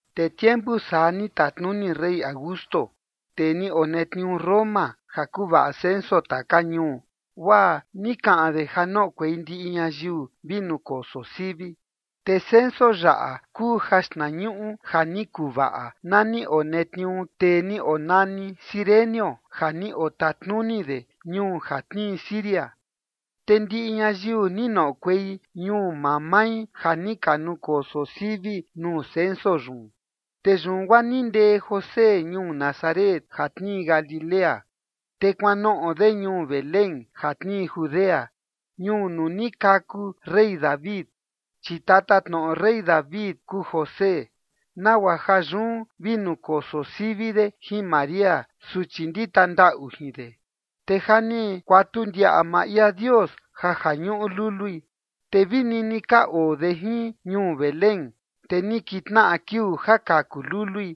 Te tiempu saa ni tatnuni rey Augusto, tee ni onetniuu Roma, ja vi nukoso sivi ñayiu taka ñuu, guaa ni kaꞌan de ja noꞌokuei ndiꞌi ñayiu vi nukoso sivi. Te ja ni ka nukoso sivi yaꞌa kuu jaxtnañuꞌu ja ni kuvaꞌa na ni onetniuu tee ni onani Cirenio ja ni otatnuni de ñuu ja tnii Siria. Te ndiꞌi ñayiu ni noꞌokuei ñuu maa mai ja ni ka nukoso sivi nuu censo yun. Te yun guaa ni ndee José ñuu Nazaret ja tnii Galilea, te kuanoꞌo de ñuu Belén ja tnii Judea, ñuu nuu ni kaku rey David, chi tatatnoꞌo rey David kuu José, nagua ja yun vi nukoso sivi de jin María, suchi ndita ndaꞌu jin de. Te ja ni kuatu ndiaꞌa maa ia Dios ja ja ñuꞌu lului. Te vi nini ka oo de jin ñuu Belén, te ni kintnaꞌa kiuu ja kaku lului.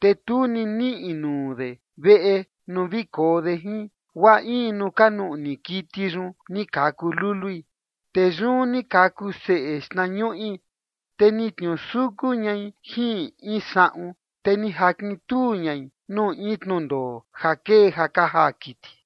Te tu ni niꞌi nuu de veꞌe nuu vi koo de jin, guaa in nuu ka nuꞌni kiti yun, ni kaku lului. Te yun ni kaku seꞌe xnañuꞌi, te ni tniusuku ñai jin in saꞌun, te ni jakintuu ñai nuu in tnundoo ja kee ja ka jaa kiti.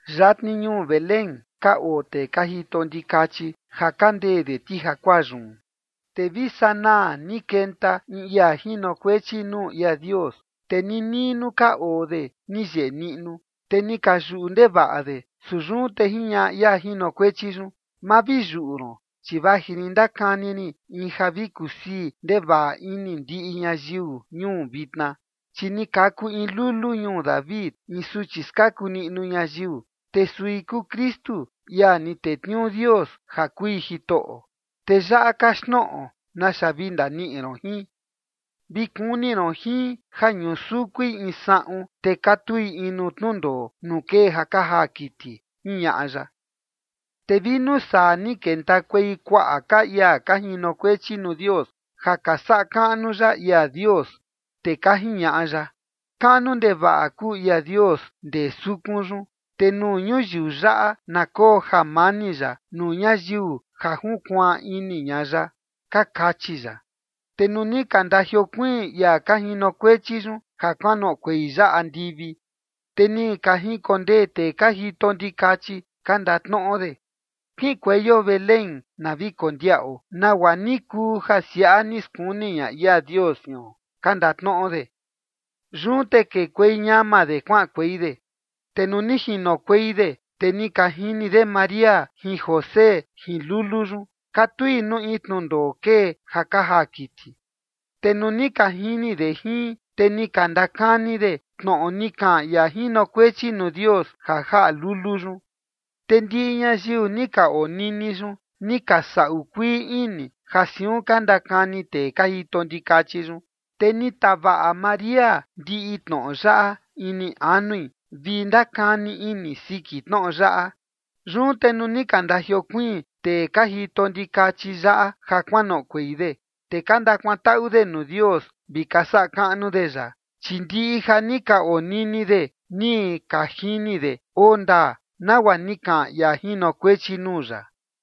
Yatni ñuu Belén ka oo tee ka jito ndikachi ja ka ndee de ti jakuaa yun. Te vi sanaa ni kenta in ia jinokuechi nuu ia Dios, te ninii nuu ka oo de ni yeꞌe niꞌnu, te ni ka yuꞌu ndevaꞌa de. Su yun te jiñaꞌa ia jinokuechi yun: ―Ma vi yuꞌu ron, chi vaji rin ndakani rin in ja vi kusii ndevaꞌa ini ndiꞌi ñayiu ñuu vitna, chi ni kaku in lulu ñuu David, in suchi skaku niꞌnu ñayiu, te sui kuu Kristu, ia ni tetniuu Dios ja kui Jitoꞌo. Te yaꞌa kaxtnoꞌo naxa vi ndaniꞌi ron jin: Vi kuni ron jin ja ñusukui in saꞌun, te katui in nuu tnundoo nuu kee ja ka jaa kiti ―jiñaꞌa ya. Te vi nuu saa ni kentakuei kuaꞌa ka ia ka jinokuechi nuu Dios ja ka saꞌa kaꞌnu ya ia Dios, te ka jiñaꞌa ya: Kaꞌnu ndevaꞌa kuu ia Dios ndee sukun yun, te nuu ñuyiu yaꞌa na koo jamani ya nuu ñayiu ja junkuaan ini ña ya, ka kachi ya. Te nuu ni ka ndajiokuiin ia ka jinokuechi yun ja kuanoꞌokuei ya andivi, te ni ka jinkondee tee ka jito ndikachi ka ndatnoꞌo de: ―Kiꞌinkueio Belén na vi kondiaꞌo nagua ni kuu ja siaꞌa ni skuni ña ia Dios jion ―ka ndatnoꞌo de. Yun te kekuei ñama de kuaꞌankuei de, te nuu ni jinokuei de, te ni ka jini de María jin José jin lulu yun katui nuu in tnundoo kee ja ka jaa kiti. Te nuu ni ka jini de jin, te ni ka ndakani de tnoꞌo ni kaꞌan ia jinokuechi nuu Dios, ja jaꞌa lulu yun. Te ndiꞌi ñayiu ni ka onini yun ni ka saꞌu kuii ini ja siun ka ndakani tee ka jito ndikachi yun. Te ni tavaꞌa María ndiꞌi tnoꞌo yaꞌa ini anui vi ndakani ini siki tnoꞌo yaꞌa. Yun te nuu ni ka ndajiokuiin tee ka jito ndikachi yaꞌa ja kuanoꞌokuei de, te ka ndakuantaꞌu de nuu Dios, vi ka saꞌa kaꞌnu de ya, chi ndiꞌi ja ni ka onini de ni ka jini de oo ndaa, nagua ni kaꞌan ia jinokuechi nuu ya.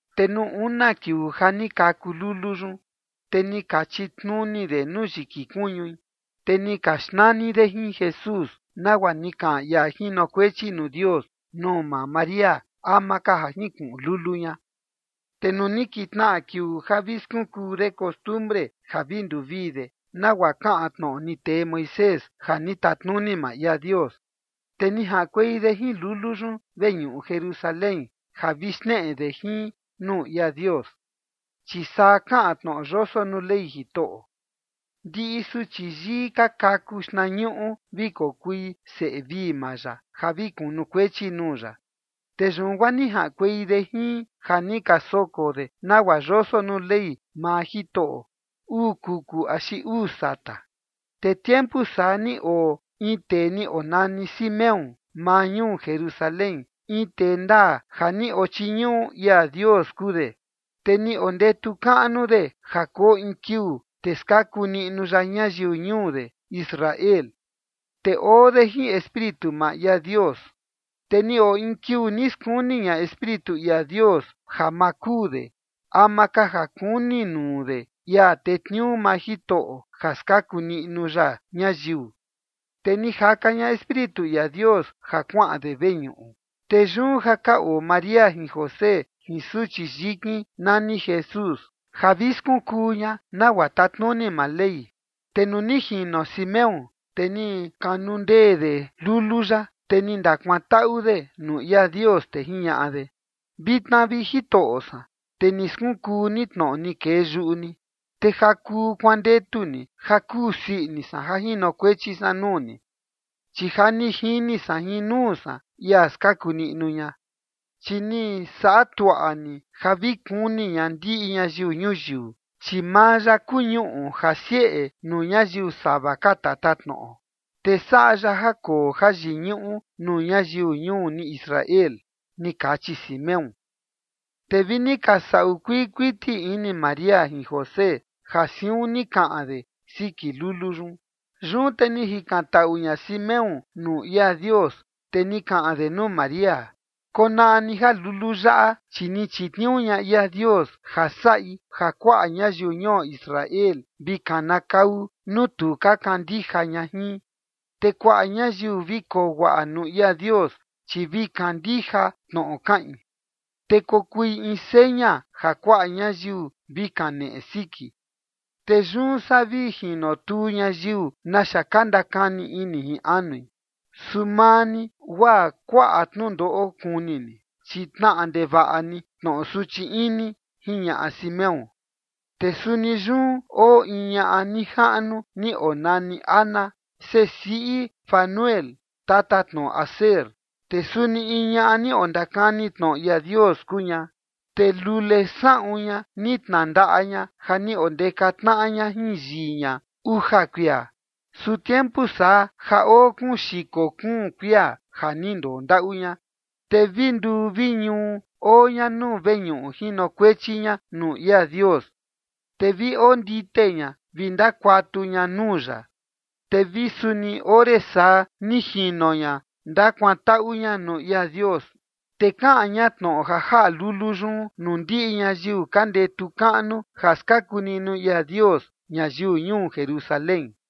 Te nuu una kiuu ja ni kaku lulu yun, te ni ka chitnuni de nuu yiki kuñui, te ni ka xnani de jin Jesús, nagua ni kaꞌan ia jinokuechi nuu Dios nuu maa María ama ka ja jinkuꞌun lulu ña. Te nuu ni kintnaꞌa kiuu ja vi skunkuu de costumbre ja vi nduvii de nagua kaꞌan tnoꞌo ni tee Moisés ja ni tatnuni maa ia Dios, te ni jaꞌankuei de jin lulu yun veñuꞌu Jerusalén ja vi xneꞌe de jin nuu ia Dios. Chi saa kaꞌan tnoꞌo yoso nuu Ley Jitoꞌo: “Ndiꞌi suchi yii ka kaku xtnañuꞌu vi kokui seꞌe vii maa ya ja vi kunukuechi nuu ya”. Te yun guaa ni jaꞌankuei de jin ja ni ka soko de nagua yoso nuu Ley maa Jitoꞌo: uu kuku axi uu sata. Te tiempu saa ni oo in tee ni onani Simeón maa ñuu Jerusalén. In tee ndaa ja ni ochiñuꞌu ia Dios kuu de, te ni ondetu kaꞌnu de ja koo in kiuu, te skaku niꞌnu ya ñayiu ñuu de Israel. Te oo de jin Espíritu maa ia Dios. Te ni oo in kiuu ni skuni ña Espíritu ia Dios ja maa kuu de ama ka ja kuni nuu de ia tetniuu maa Jitoꞌo ja skaku niꞌnu ya ñayiu. Te ni jaka ña Espíritu ia Dios ja kuaꞌan de veñuꞌu. Te yun, ja ka oo María jin José jin suchi yikin nani Jesús, ja vi skunkuu ña nagua tatnuni maa Ley. Te nuu ni jino Simeón, te ni kanundee de lulu yaꞌa, te ni ndakuantaꞌu de nuu ia Dios, te jiñaꞌa de: Vitna, vi Jitoꞌo san, te ni skunkuu ni tnoꞌo ni kee yuꞌu ni, te ja kuu kuandetu ni ja kuu sii ini san ja jinokuechi san nuu ni, chi ja ni jini san jin nuu san ia skaku niꞌnu ña. Chi ni saꞌa tuaꞌa ni ja vi kuni ña ndiꞌi ñayiu ñuyiu. Chi maa ya kuu ñuꞌu ja sieꞌe nuu ñayiu sava ka tatatnoꞌo, te saꞌa ya ja koo jayiñuꞌu nuu ñayiu ñuu ni Israel ni kachi Simeón. Te vi ni ka saꞌu kuii kuiti ini María jin José ja siun ni kaꞌan de siki lulu yun. Yun te ni jikantaꞌu ña Simeón nuu ia Dios, te ni kaꞌan de nuu María: ―Konaꞌa ni ja lulu yaꞌa, chi ni chitniuu ña ia Dios ja saꞌi ja kuaꞌa ñayiu ñuo Israel vi kanakau nuu tu ka kandija ña jin, te kuaꞌa ñayiu vi koo guaꞌa nuu ia Dios, chi vi kandija tnoꞌo kaꞌin. Te kokui in seña ja kuaꞌa ñayiu vi kaneꞌe siki. Te yun saa vi jinotuu ñayiu naxa ka ndakani ini jin anui, su maa ni guaa kuaꞌa tnundoꞌo kuni ni, chi tnaꞌa ndevaꞌa ni tnoꞌo suchi ini ―jiñaꞌa Simeón. Te suni yun oo in ñaꞌa nijaꞌnu ni onani Ana, seꞌe siꞌi Fanuel tatatnoꞌo Aser, te suni in ñaꞌa ni ondakani tnoꞌo ia Dios kuu ña. Te lule saꞌun ña ni tnandaꞌa ña ja ni ka ondekatnaꞌa ña jin yii ña uja kuia. Su tiempu saa, ja oo kuun xiko kuun kuia ja ni ndondaꞌu ña, te vi nduu vi ñuu oo ña nuu veñuꞌu jinokuechi ña nuu ia Dios. Te vi ondite ña vi ndakuatu ña nuu ya. Te vi suni ore saa, ni jino ña ndakuantaꞌu ña nuu ia Dios, te kaꞌan ña tnoꞌo ja jaꞌa lulu yun nuu ndiꞌi ñayiu ka ndetu kaꞌnu ja skaku niꞌnu ia Dios ñayiu ñuu Jerusalén.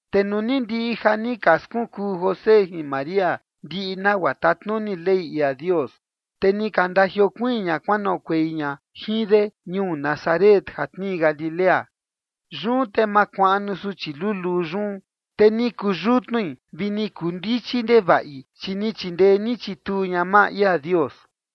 Te nuu ni ndiꞌi ja ni ka skunkuu José jin María ndiꞌi nagua tatnuni Ley ia Dios, te ni ka ndajiokuiin ña kuanoꞌokuei ña jin de ñuu Nazaret ja tnii Galilea. Yun te makuaꞌnu suchi luluu yun, te ni kuu yutnui vi ni kuu ndichi ndevaꞌi, chi ni chindee ni chituu ña maa ia Dios.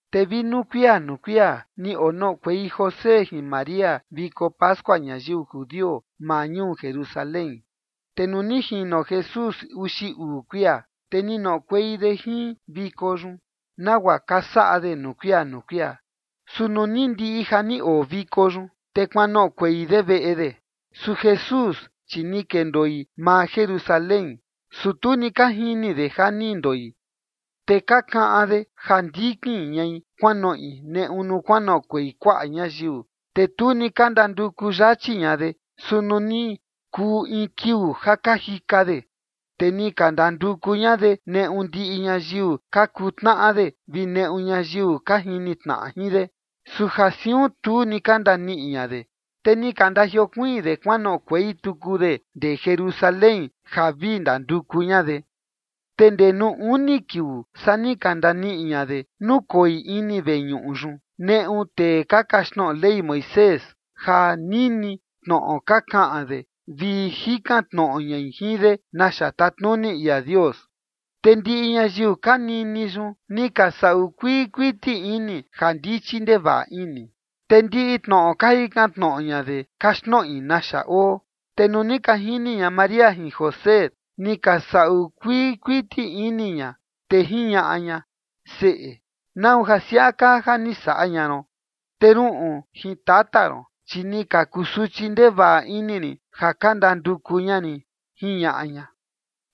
Te vi nuu kuia nuu kuia, ni onoꞌokuei José jin María viko pascua ñayiu judio maa ñuu Jerusalén. Te nuu ni jino Jesús uxi uu kuia, te ni noꞌokuei de jin viko yun, nagua ka saꞌa de nuu kuia nuu kuia. Su nuu ni ndiꞌi ja ni oo viko yun, te kuanoꞌokuei de veꞌe de. Su Jesús, chi ni kendoi maa Jerusalén, su tu ni ka jini de ja ni ndoi. Te ka kaꞌan de ja ndikin ñai kuanoꞌi neꞌu nuu kuanoꞌokuei kuaꞌa ñayiu, te tu ni ka ndanduku yachi ña de. Su nuu ni kuu in kiuu ja ka jika de, te ni ka ndanduku ña de neꞌu ndiꞌi ñayiu ka kuu tnaꞌa de vi neꞌu ñayiu ka jini tnaꞌa jin de. Su ja siun, tu ni ka ndaniꞌi ña de, te ni ka ndajiokuiin de kuanoꞌokuei tuku de ndee Jerusalén ja vi ndanduku ña de. Te ndee nuu uni kiuu, saa ni ka ndaniꞌi ña de nukoi ini veñuꞌu yun, neꞌu tee ka kaxtnoꞌo Ley Moisés ja nini tnoꞌo ka kaꞌan de vi jikan tnoꞌo ñai jin de naxa tatnuni ia Dios. Te ndiꞌi ñayiu ka nini yun, ni ka saꞌu kuii kuiti ini ja ndichi ndevaꞌa ini, te ndiꞌi tnoꞌo ka jikan tnoꞌo ña de kaxtnoꞌi naxa oo. Te nuu ni ka jini ña María jin José, ni ka saꞌu kuii kuiti ini ña, te jiñaꞌa ña: ―Seꞌe, ¿nau ja siaꞌa kaa ja ni saꞌa ña ron? Te ruꞌun jin tata ron, chi ni ka kusuchi ndevaꞌa ini rin ja ka ndanduku ña rin ―jiñaꞌa ña.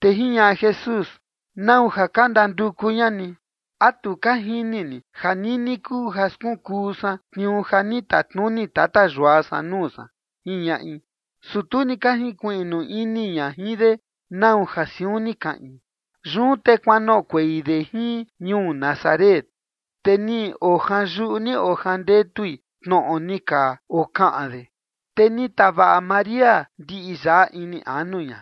Te jiñaꞌa Jesús: ―¿Nau ja ka ndanduku ña ni? ¿A tu ka jini ni ja nini kuu ja skunkuu san tniuu ja ni tatnuni tata yua san nuu san? ―jiñaꞌi. Su tu ni ka jinkuiꞌnu ini ña jin de nau ja siun ni kaꞌin. Yun te kuanoꞌokuei de jin ñuu Nazaret, te ni ojanyuꞌu ni ojandetui tnoꞌo ni ka okaꞌan de. Te ni tavaꞌa María ndiꞌi yaꞌa ini anu ña.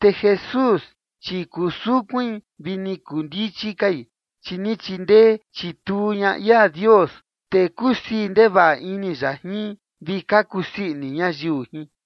Te Jesús, chi kuu sukuin vi ni kuu ndichi kai, chi ni chindee chituu ña ia Dios, te kusii ndevaꞌa ini ya jin, vi ka kusii ini ñayiu jin.